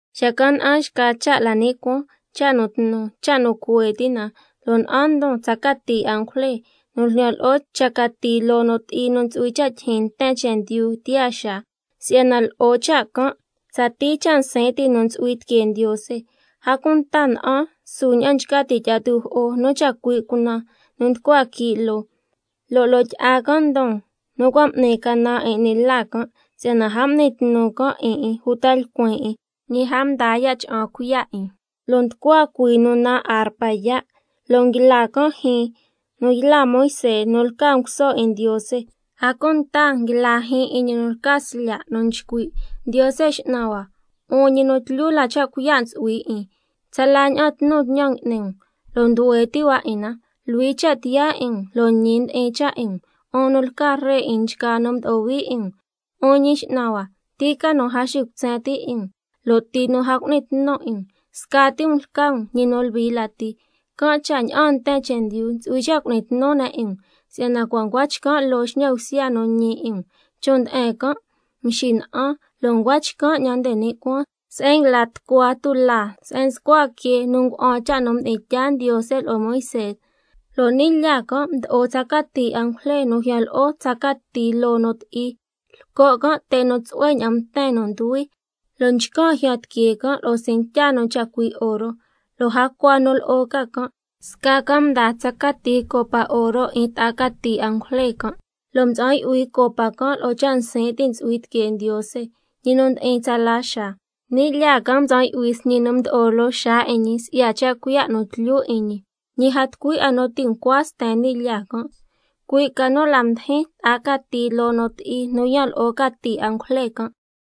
Xacan' na'an xca cha' la ni' cuaan, cha' nu tnu, cha' nu cuhue ti' na, lo' na'an ndon tsa cati angujle nu ljyan lo'o cha cati loo nu ti'i nu ntsu'hui cha' tyijyin nten chendyu tiyaa xaa, si'yana lo'o cha' can' tsatii cha' nsin' ti' nu ntsu'hui tiquee Ndiose. A cunta na'an su ña'an nchca ti' tyi'a tujo'o nu chacui' cunan nu nducua quii' loo, lo' loo tyi'a can' ndon nu cua' m'ni canan 'in 'ni la can', si'yana a m'ni tnu can' 'in 'in uta lcuin 'in, ñi a mdaa ya' cha'an cuiya' 'in, lo' nducua cuhuii nu naan arpa yaa', lo' nguila can' jyiin nu yla Moisé nu lca nguso 'in Ndiose, a cunta nguila jyiin 'in ñi nu lca Slya' nu nchcui': Ndiose X'nan hua, 'un ñi nu tlyu la cha' cuiya' ntsu'hui 'in, tsala ña'an tnu tñan ngui'ni um lo' nduhue ti' hua 'in na, luhui cha' tiyaa 'in um lo' ñi ndi'in cha' 'in um, 'un nu lca Ree 'in nchgaa nu mdo'o hui 'in um. 'Un Ñi X'nan hua, ¿ti ca nu a xicutsen ti' 'in um, lo' ti nu a cu'ni tnu 'in um? Scati um lca um ñi nu luhui lati, can' cha' ña'aan nten chendyu ntsu'hui cha' cu'ni tnu ne' 'in um, si'yana cua' ncua chcan' loo xñan bsya nu ñi 'in um. Chon' nde'en can' mxina'an, lo' ncua chcan' 'ñan nde ni' cuaan se'en nguila tucua tulaa se'en nscua quee nu nga'an cha' nu mdi'in tyaa Ndiose lo'o Moisé, lo' ni' lyaa can' mdo'o tsa cati angujle nu ljyan lo'o tsa cati loo nu ti'i, lco' can' te' nu tsu'hue ña'an mten nu nduhui, lo' nchcan' jyan tiquee can' lo'o cintya nu chacui' oro. Lo' jacua nu lo'o ca can', sca can' mdaa tsa cati copa oro 'in ta'a cati angujle can', lo' mtsa'an yu'hui copa can' lo'o cha' nsin' ti' ntsu'hui tiquee Ndiose, ñi nu ndi'in tsala xaa. Ni' lyaa can' mtsa'an yu'hui sñi nu mdo'o loo xaa 'in ñi si'ya cha' cuiya' nu tlyu 'in ñi, ñi a tucui 'a nu ti' ncua sten ni' lyaa can', cui' ca nu la mdijin ta'a cati loo nu ti'i nu yan lo'o cati angujle can'.